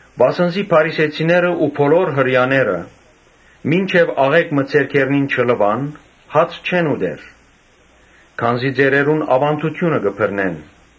Վասն զի փարիսեցիներն ու բոլոր Հրեաները մինչեւ աղէկ մը ձեռքերնին չլուան՝ հաց չեն ուտեր, քանզի ծերերուն աւանդութիւնը կը բռնեն։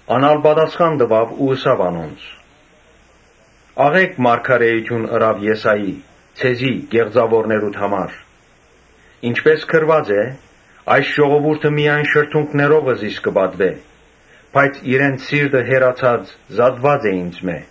Ան ալ պատասխան տուաւ ու ըսաւ անոնց. «Աղէկ մարգարէութիւն ըրաւ Եսայի ձեզի՝ կեղծաւորներուդ համար, ինչպէս գրուած է. ‘Այս ժողովուրդը միայն շրթունքներովը զիս կը պատուէ, բայց իրենց սիրտը հեռացած, զատուած է ինծմէ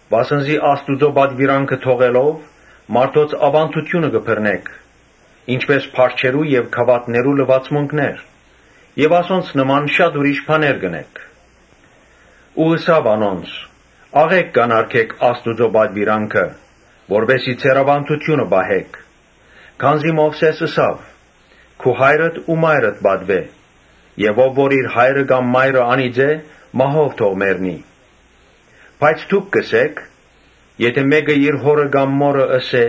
Վասն զի Աստուծոյ պատուիրանքը թողելով՝ մարդոց աւանդութիւնը կը բռնէք, ինչպէս՝ փարչերու եւ գաւաթներու մաքրութիւններ եւ ասոնց նման շատ ուրիշ բաներ կ’ընէք»։ Ու ըսաւ անոնց. «Աղէկ կ’անարգէք Աստուծոյ պատուիրանքը, որպէս զի ձեր աւանդութիւնը պահէք։ Քանզի Մովսէս ըսաւ. ‘Քու հայրդ ու մայրդ պատուէ. եւ Ով որ իր հայրը կամ մայրը անիծէ, մահով թող մեռնի’։ Բայց դուք կ’ըսէք. ‘Եթէ մէկը իր հօրը կամ մօրը ըսէ՝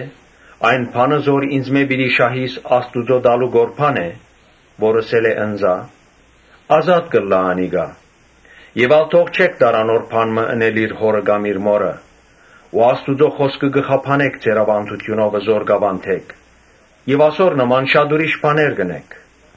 ‘Այն բանը զոր ինծմէ պիտի շահիս Աստուծոյ տալու կորբան է, (որ ըսել է՝ ընծայ,) ազատ կ’ըլլայ անիկա’. Եւ ա՛լ թող չէք տար անոր բան մը ընել իր հօրը կամ իր մօրը. Ու Աստուծոյ խօսքը կը խափանէք ձեր աւանդութիւնովը եւ ասոր նման շատ ուրիշ բաներ կ’ընէք»։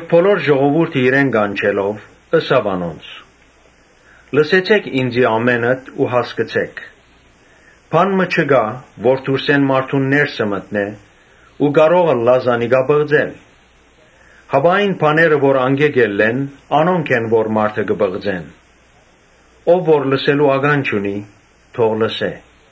Բոլոր ժողովուրդը իրեն կանչելով՝ ըսաւ անոնց. «Լսեցէք ինծի ամէնքդ ու հասկցէք։ Բան մը չկայ որ դուրսէն մարդուն ներսը մտնէ ու կարող ըլլայ զանիկա պղծել, հապա այն բաները, որ անկէ կ’ելլեն, անոնք են որ մարդը կը պղծեն։ Ով որ լսելու կանջ ունի՝ թող լսէ»։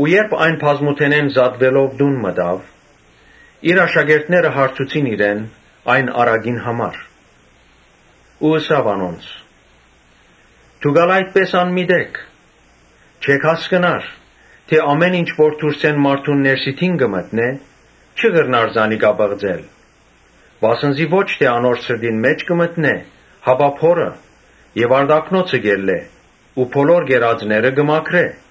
Երբ ինք այն բազմութենէն զատուելով տուն մտաւ, իր աշակերտները հարցուցին իրեն այն առակին համար։ Ըսաւ անոնց. «Դո՞ւք ալ այդպէս անմիտ էք. չէ՞ք հասկնար թէ ամէն ինչ որ դուրսէն մարդուն ներսիդին կը մտնէ, չի կրնար զանիկա պղծել. Վասն զի ոչ թէ անոր սրտին մէջ կը մտնէ, հապա փորը եւ արտաքնոցը կ’ելլէ (ուստի բոլոր ուտելիքները մաքուր են)»։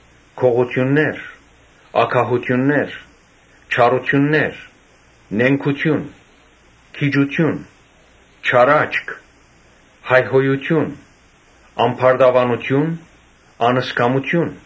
Գողութիւններ, ագահութիւններ, չարութիւններ, նենգութիւն, գիջութիւն, չար աչք, հայհոյութիւն, ամբարտաւանութիւն, անզգամութիւն։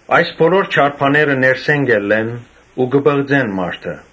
Այս բոլոր չար բաները ներսէն կ’ելլեն ու կը պղծեն մարդը»։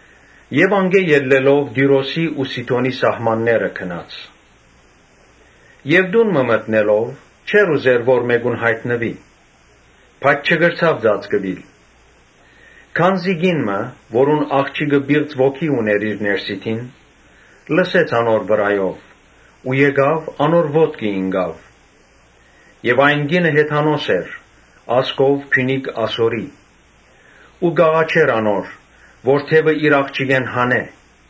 Անկէ ելլելով Տիւրոսի ու Սիդոնի սահմանները գնաց։ Տուն մը մտնելով չէր ուզեր որ մէկուն յայտնուի, բայց չկրցաւ ծածկուիլ։ Ահա կին մը, որուն աղջիկը պիղծ ոգի ունէր իր ներսիդին, լսեց անոր գալը, եկաւ, անոր ոտքը ինկաւ։ Այն կինը Յուն., Յոյնհեթանոս էր, ազգով Փիւնիկ Ասորի ու կ’աղաչէր անոր՝ որ դեւը իր աղջիկէն հանէ։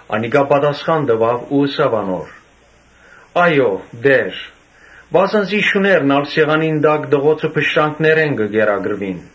Անիկա պատասխան տուաւ ու ըսաւ անոր. «Այո՛, Տէ՛ր, վասն զի շուներն ալ՝ սեղանին տակ տղոցը փշրանքներէն կը կերակրուին»։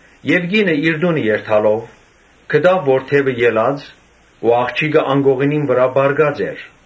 Կինը իր տունը երթալով, գտաւ որ դեւը ելած էր ու աղջիկը անկողնին վրայ պառկած էր։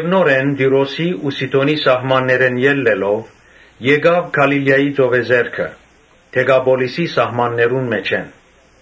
Նորէն Տիւրոսի ու Սիդոնի սահմաններէն ելլելով, գնաց Գալիլիայի ծովեզերքը, Դեկապոլիսի սահմաններուն մէջէն։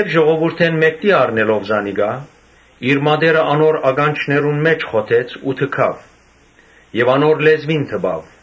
Ժողովուրդէն մէկդի առնելով զանիկա, իր մատները անոր ականջներուն մէջ խոթեց ու թքաւ, եւ անոր լեզուին դպաւ,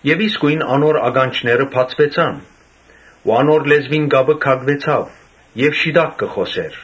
Եւ իսկոյն անոր ականջները բացուեցան ու անոր լեզուին կապը քակուեցաւ եւ շիտակ կը խօսէր։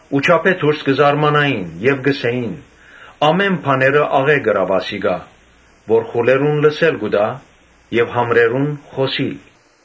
Ու չափէ դուրս կը զարմանային ու կ’ըսէին. «Ամէն բաները աղէկ ըրաւ ասիկա, որ խուլերուն լսել կու տայ եւ համրերուն՝ խօսիլ»։